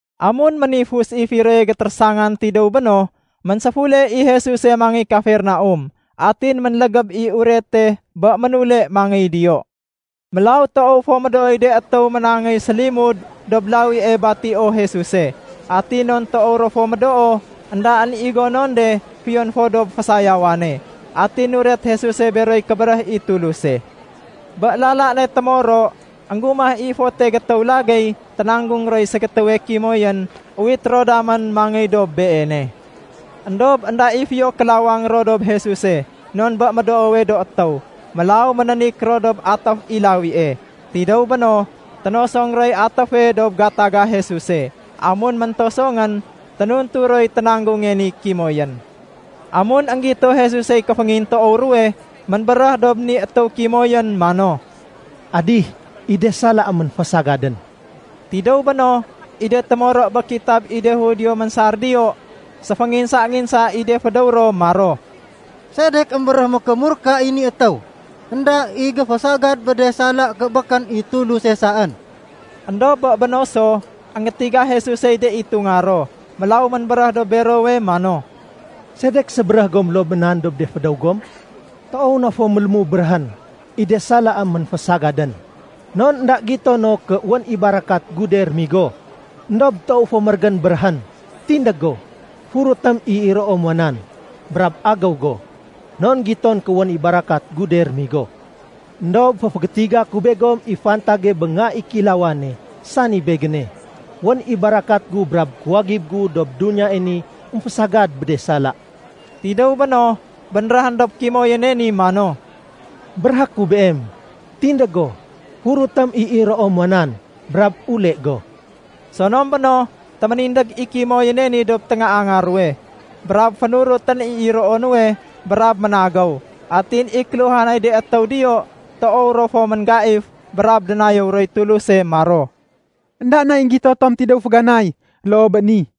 Amun ménifus i firoye gétérésangan tidéw béno, ménséfule i Jesuse mangéy Kafernaum. Atin ménlégéb i urete bé ménule mangéy diyo. Mélaw toow fo médooy de étéw ménangéy sélimud dob lawie batio Jesuse. Atin non toow ro fo médoo, éndaén i gonon de fiyon fo dob fésayawane. Atin nuret Jesuse beroy kébéréh i Tuluse. Bé lala ne témoro, énggumah i fote gétéw lagéy ténanggung roy ségétéwe kimoyén, uwité ro damén mangéy dob Beene. Endob énda i fiyo kélawang ro dob Jesuse, non bé médoowe do étéw. Mélaw ménénik ro dob atéf i lawie. Tidéw béno, ténosong roy atéfe dob gataga Jesuse. Amun méntosongén, ténuntu roy ténanggunge ni kimoyén. Amun énggito Jesusey kéféngintoow ruwe, ménbéréh dob ni étéw kimoyén mano, “Adih, i de salaém ménfésagadén.” Tidéw béno, i de témoro bé kitab i de Judio ménsar diyo, séfénginsa-nginsa i de fédéw ro maro, “Sedek émbéréh mékémurka i ni étéw? Enda i géfésagad bé de sala ké békén i Tuluse saén!” Endob bé béno so, énggétiga Jesusey de itunga ro. Mélaw ménbéréh dob berowe mano, “Sedek sébéréh gom loo bé nan dob de fédéw gom? Toow na fo mélému béréhén, ‘I de salaém ménfésagadén.’ Non énda gito no ké wén i barakat gu de rémigo. Endob toow fo mérégén béréhén, ‘Tindég go, furutém i iroo muwa nan, brab agéw go.’ Non giton ké wén i barakat gu de rémigo. Endob féfégétiga ku begom i fantage bé Nga i Kéilawane, sani Begéne. Wén i barakat gu brab kuwagib gu dob duniyae ni émfésagad bé de sala.” Tidéw béno, bénréhén dob kimoyéne ni mano, “Béréhé ku beem, tindég go, furutém i iroo muwa nan, brab ule go.” Sonom béno, téménindég i kimoyéne ni dob téngaanga ruwe, brab fénurutén i iroo nuwe, brab ménagéw. Atin i kéluhanay de étéw diyo, toow ro fo ménggaif brab dénayéw roy Tuluse maro, “Enda nay énggito tom tidéw féganay loo bé ni.”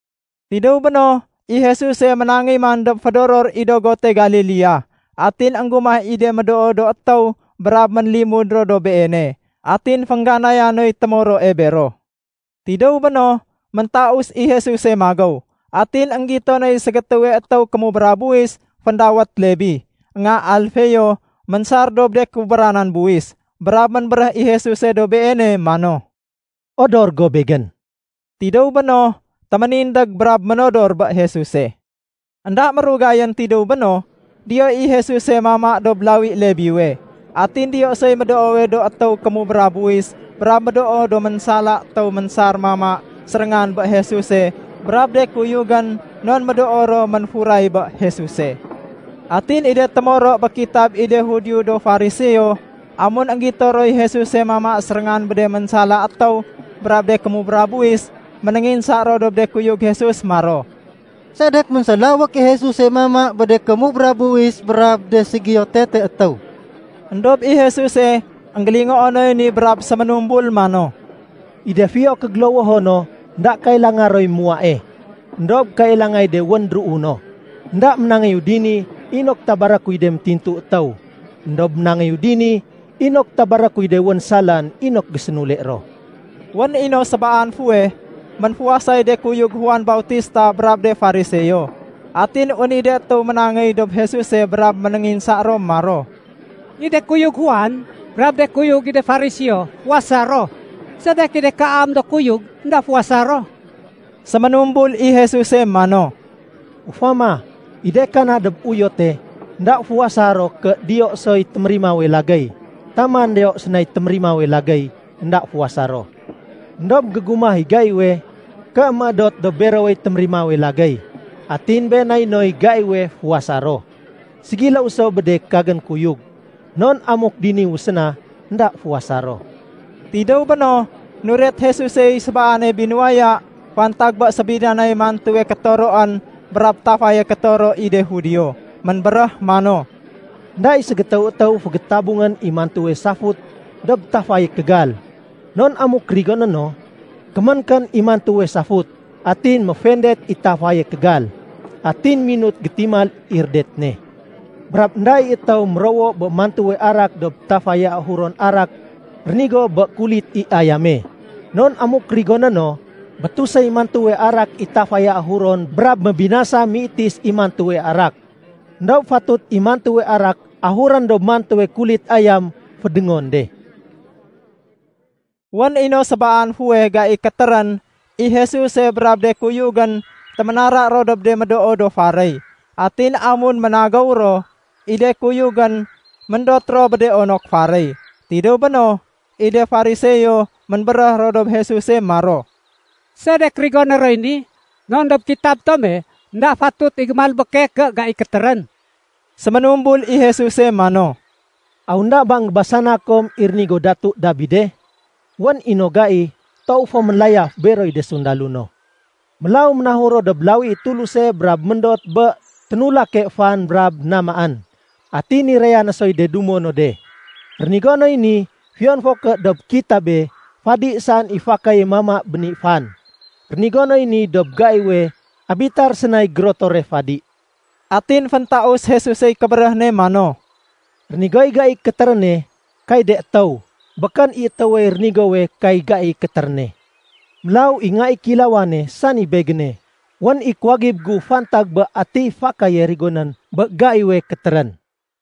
Tidéw béno, i Jesuse ménangéy man dob fédoror i dogote Galilea. Atin énggumah i de médoo do étéw brab ménlimud ro dob Beene. Atin féngganaya noy témoroe bero. Tidéw béno, méntaus i Jesuse magéw. Atin énggito noy ségétéwe étéw kémubra buwis féndawét Lebi, nga Alfeo ménsar dob de kubranan buwis. Brab ménbéréh i Jesuse dob beene mano, “Odor go Begén.” Tidéw béno, téménindég brab ménodor bé Jesuse. Enda mérugayén tidéw béno, diyo i Jesuse mama dob lawi Lebiwe. Atin diyo soy médoowe do étéw kémubra buwis brab médoo do ménsala étéw ménsar mama séréngan bé Jesuse brab de kuyugén, non médoo ro ménfuray bé Jesuse. Atin i de témoro bé kitab i de Judio do Fariseo, amun énggito roy Jesuse mama séréngan bé de ménsala étéw brab de kémubra buwis, ménénginsa ro dob de kuyug Jesus maro, “Sedek ménsélawék i Jesuse mama bé de kémubra buwis brab de ségiyo tete étéw?” Endob i Jesuse énggélingoo noy ni brab séménumbul mano, “I de fiyo kégélowoho no, énda kailanga roy muwae, éndob kailangay de wén déruu no. Enda ménangéyu dini inok tabaré kuy de métintu étéw, éndob ménangéyu dini inok tabaré kuy de wén salaén inok gésénule ro.” Wén i no sébaan fuweh, ménfuwasay de kuyug Juan Bautista brab de Fariseo. Atin wén i de étéw ménangéy dob Jesuse brab ménénginsa ro maro, “I de kuyug Juan brab de kuyug i de Fariseo, fuwasa ro. Sedek i de kaam do kuyug énda fuwasa ro?” Séménumbul i Jesuse mano, “Ufama, i de kana dob uyote, énda fuwasa ro ké diyo soy témérimawe lagéy. Taman diyo sénay témérimawe lagéy, énda fuwasa ro. Endob gégumah i gaiwe, ké méédot dob berowey témérimawe lagéy. Atin been nay noy gaiwe fuwasa ro. Ségiléw so bé de kagén kuyug, non amuk diniwu séna, énda fuwasa ro.” Tidéw béno, nuret Jesusey sébaane binuwaya fantag bé sébidanay mantuwe kétoroén brab tafaye kétoro i de Judio. Ménbéréh mano, “Enda i ségétéw étéw fégétabungén i mantuwe safut dob tafaye kégal. Non amuk rigoné no, kéménkén i mantuwe safut, atin méfendet i tafaye kégal, atin minut gétimal i rédet ne. Brab énda i étéw mérowo bé mantuwe arak dob tafaye ahuron arak rénigo bé kulit i ayame. Non amuk rigoné no, bétus i mantuwe arak i tafaye ahuron brab mébinasa méitis i mantuwe arak. Endob fatut i mantuwe arak ahurén dob mantuwe kulit ayam fédéngon de.” Wén i no sébaan fuweh gai kétérén, i Jesuse brab de kuyugén téménara ro dob de médoo do faréy. Atin amun ménagéw ro, i de kuyugén méndot ro bé de onok faréy. Tidéw béno, i de Fariseo ménbéréh ro dob Jesuse maro, “Sedek rigoné roy ni, non dob kitab tome énda fatut i gémalbéke ké gai kétérén?” Séménumbul i Jesuse mano, “Aw énda ba énggébasana kom i rénigo Datu Dabide? Wén i no gai toow fo mélayaf beroy de sundalo no. Mélaw ménahur ro dob lawi i Tuluse brab méndot bé ténulake fan brab namaén, atin niraya no soy de dumo no de. Rénigo noy ni fiyon fo ké dob kitabe fadi saén i fakaye mama bé ni fan. Rénigo noy ni dob gaiwe Abitar sénay gérotore fadi.” Atin féntaus Jesusey kébéréh ne mano, “Rénigoy gai kétéréne kay de étéw, békén i étéwey rénigowe kay gai kétéréne. Mélaw i Nga i Kéilawane, sani Begéne, wén i kuwagib gu fantag bé atiy fakaye rigonén bé gaiwe kétérén.”